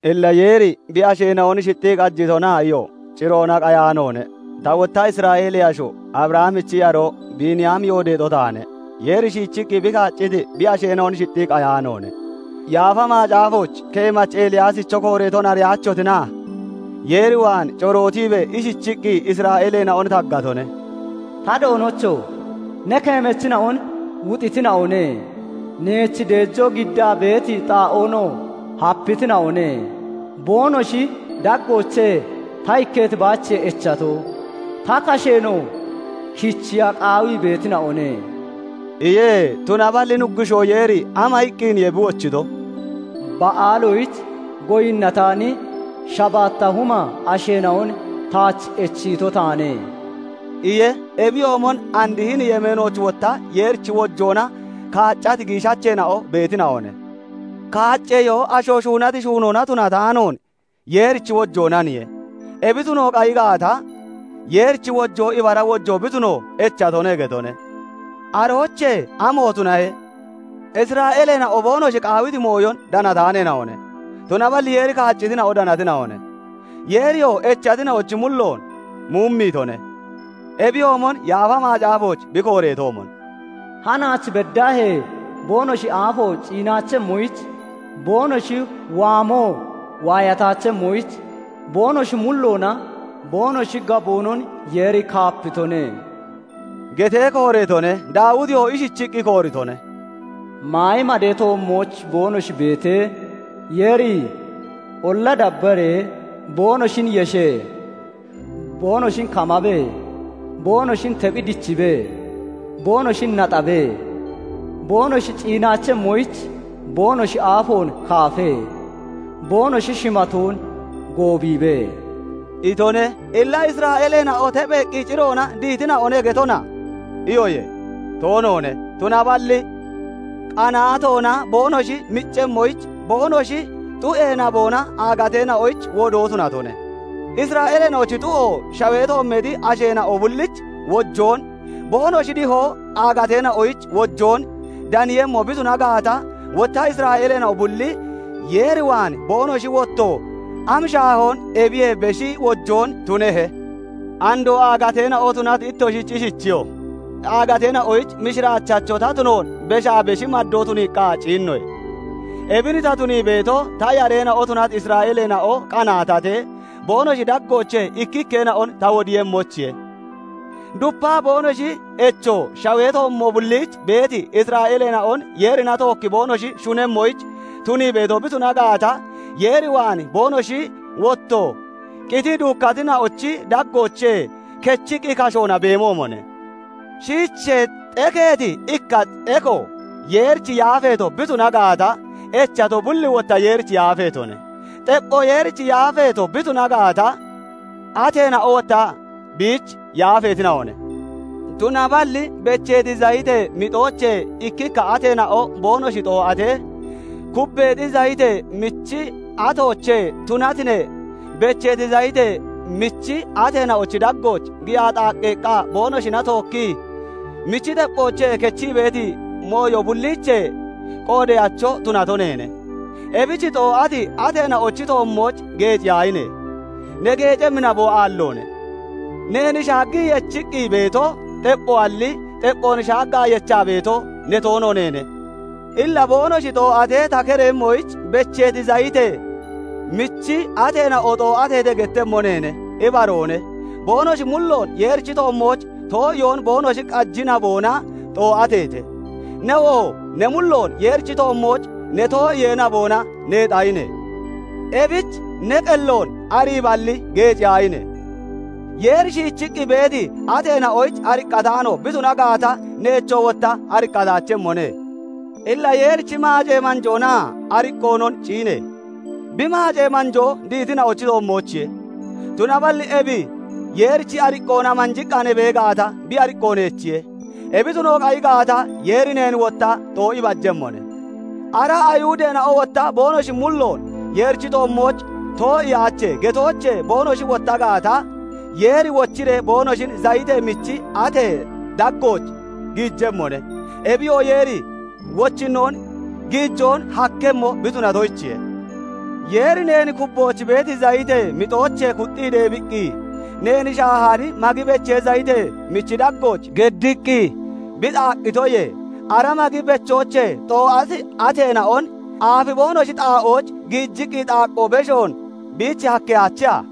Illa "Yeeri bi asheena'on shixxii qajitona?" iyo. Ciroona qayaanoone. Ta wotta Isra'eelee asho, Abrahamichi yaroo, Biiniyaami yoodeexo taane. Yeeri shiichiqqi bi kaacciti bi asheena'on shixxii qayaanoone. Yaafa Macaafooch keemachi Eliyaasicho kooreeton ariyaachotina? Yeer waan corootiibee ishichiqqi Isra'eeleena'on taggatone; "Ta Doonocho! Ne keemachina'on wuxitina'one; neech deejoo giddaa beeti xaa'oonoo hapitina'one; boonoshi daggoochee ta ikketo baachiye echato; ta kasheenoo kichiya qaawii beetina'one" iye. Tunaballi Nuggushoo Yeeri ama iqqiniye bi wochito? "Ba'aalooyich goyinnataani shabaatta huma asheena'on taach echiito taane" iye. Ebiyoomon and hini yemeenooch wotta Yeerichi wojoona kaaccati giishacheena'o beetina'one. Kaacceyoo asho shuunati shuunoona tunataanoon Yeerichi wojoonaniye; ebi tuno qayi gaata, Yeerichi wojoo ibara wojoo bi tuno echatone getone. Aroochee amo tunahe? Isra'eeleena'o boonoshi qaawiti mooyon danataaneena'one; tunaballi Yeeri kaaccitina'o danatina'one; Yeeriyoo echatina'ochi mulloon muumiitone. Ebiyoomon Yaafa Macaafooch bi kooreetoomon, "Hanaach beddaahee boonoshi aafo ciinaachemmoyich, boonoshi waamoo waayataachemmoyich, boonoshi mulloonaa boonoshi gaboonon Yeeri kaapitone" getee kooreetone. Daawitiyoo ishichiqqi kooritone:- "Maayi madee toommooch boonoshi beetee, Yeeri olla dabbaree boonoshin yeshe; boonoshin kamabe; boonoshin tephi dichibe; boonoshin naxabe; boonoshi ciinaachemmoyich boonoshi aafoon kaafe; boonoshi shimatoon goobiibe" itone. Illa "Isra'eeleena'o tepheeqqi ciroona dihitina'one getona?" iyoye. Toonoone; tunaballi qanaatoona boonoshi miccemmoyich boonoshi xu'ee naboona agateena'oyich wodoo tunatone. Isra'eeleena'ochi xu'o shawee toommeexi asheena'o bullich wojoon, boonoshi dihoo aagateena'oyich wojoon daniiyemmo bi tuna gaata, wotta Isra'eeleena'o bulli Yeer waan boonoshi wotto am shaahoon ebiyee beshi wojoon tunehe? Andoo aagateena'o tunati ittoshich ishichiyo:- "Aagateena'oyich mishiraachacho ta tunoon beshaa beshi maddoon tuniiqqa ciinnoye. Ebin ta tunii beeto, ta yareena'o tunati Isra'eeleena'o qanaatatee, boonoshi daggoochee ikkikkeena'on ta wodiiyemmoyichiye. Dupaa boonoshi echo shawee toommo bulliich beeti asheena'on Yeerina tookki boonoshi shunemmoyich tunii beeto bi tuna gaata, Yeer waan boonoshi wotto qitii duukkatina'ochi daggoochee kechiqqi kashoona beemoomone. Shiichee xekeeti ikka xeko Yeerich yaafeeto bi tuna gaata, echato bulli wotta Yeerich yaafeetone. Xeppho Yeerich yaafeeto bi tuna gaata, ateena'o wotta biich yaafeetina'one. Tunaballi becheeti zayitee mixoochee ikkikka ateena'o boonoshi xoo'atee, kubbeexi zayitee michi atoochee tunati ne, becheeti zayitee michi ateena'ochi daggooch giyaa xaaqqeeqqa boonoshina tookkii michi xepphoochee kechii beeti mooyo bulliichee qoodeyacho tunato neene. Ebich xoo'ati ateena'ochi toommooch geeciyaahine! Ne geecemmi naboo aalloone. Neen shaaggii yechiqqi beeto xepphoalli, xepphoon shaaggaa yechaa beeto ne toono neene. Illa "Boonoshi xaa'ooch ta kereeyemmoyich becheeti zayitee michi ateena'o xoo'ateete" gettemmo neene. Ibaroone; boonoshi mulloon Yeerichi toommooch too'iyoon boonoshi qaji naboona xoo'aheete; newoo ne mulloon Yeerichi toommooch ne too'iyee naboona neexahine. Ebich ne qelloon ariiballi, geeciyaahine! Yeeri shiichiqqi beeti ateena'oyich ariqqataano bi tuna gaata, neechoo wotta ariqqataachemmone. Illa Yeerichi maacee manjoonaa ariqqoonon ciine! Bi maacee manjoo dihitina'ochi toommoochiye; tunaballi ebi Yeerichi ariqqoona manjiqqa ne bee gaata, bi ariqqo neechiye; ebi tuno qayi gaata, Yeeri neen wotta xoo'i bajemmone. Ara Ayihudeena'o wotta boonoshi mulloon Yeerichi toommooch "Too'iyaache" getoochee boonoshi wotta gaata, Yeeri wochiree boonoshin zayitee michi atee daggooch giijemmone; ebiyoo Yeeri wochinnon giijoon hakkemmo bi tunatoyichiye. Yeeri neen kubbooch beeti zayitee mixoochee kuxxii deebiqqi, neen shaahaani magi bechee zayitee michi daggooch geddiqqi bi xaaqqitoyee, ara magi bechoochee xoo'ati ateena'on aafi boonoshi xaa'ooch giijiqqi xaaqqoo beshoon biich kettataacheha?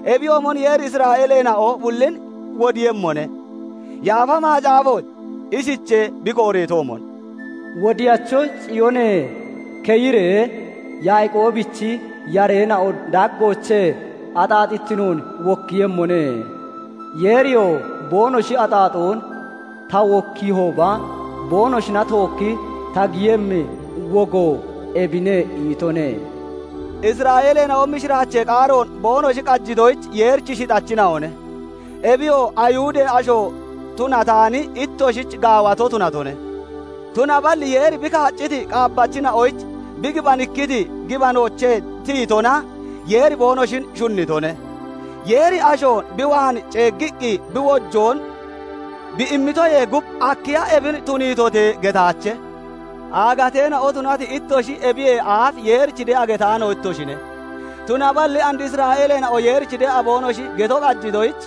Ebiyoomon Yeeri Isra'eeleena'o bullin wodiiyemmone. Yaafa Macaafooch ishichee bi kooreetoomon:- "Wodiyacho Ciyoonee keyiree, Yaaqoobichi yareena'o daggoochee axaaxittinoon wokkiiyemmone. Yeeriyoo 'Boonoshi axaaxoon ta wokkiihooba, boonoshina tookki ta giyemmi wogo ebine' itone." Isra'eeleena'o mishiraachee qaaroon boonoshi qajitoyich Yeerichi shixachina'one; ebiyoo Ayihudee asho tunataani ittoshich gaawato tunatone; tunaballi Yeeri bi kaacciti qaabbachina'oyich bi gibanikkiti gibanoochee tiyitona Yeeri boonoshin shunnitone. Yeeri ashoon bi waan ceeggiqqi bi wojoon bi immitoyee gub, "Akkiya ebin tuniitote?" getaache. Aagateena'o tunati ittoshi ebiyee aaf Yeerich de'a getaano ittoshine; tunaballi and Isra'eeleena'o Yeerich de'a boonoshi geto qajitoyich,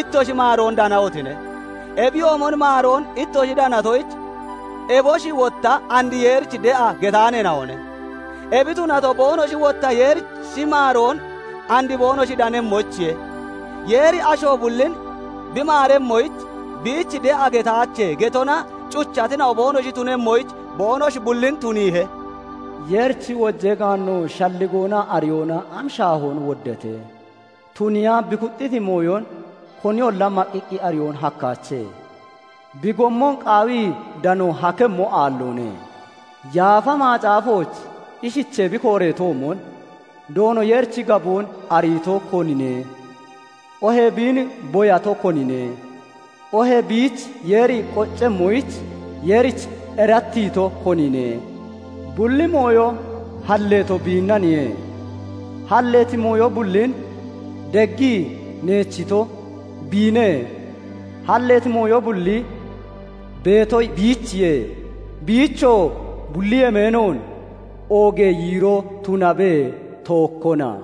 ittoshi maaroon danahotine. Ebiyoomon maaroon ittoshi danatoyich eboshi wotta and Yeerich da'a getaaneena'one; ebi tunato boonoshi wotta Yeerichi maaroon and boonoshi danemmoyichiye. Yeeri asho bullin bi maaremmoyich, biich "De'a getaache" getona cuchatina'o boonoshi tunemmoyich boonoshi bullin tuniihe. Yeerichi wojee gaanno, shalligoonaa ariyoona am shaahoon woddate! Tuniiya bi kuxxiti mooyon koniyolla maqqiqqi ariyoon hakkaache; bi gommonoo qaawi danoon hakkemmo aalloone. Yaafa Macaafooch ishichee bi kooreetoomon, "Doono Yeerichi gaboon ariito, konine? Oohee biin boyato, konine? Oohee biich Yeeri qoccemmoyich Yeerich erattiito, konine?" Bulli mooyo halleeto biinnaniye; halleeti mooyo bullin deggii neechito, biine; halleeti mooyo bulli beeto biichiye; biichoo bulli yemeenoon oogee yiiroo tunabe; tookkona.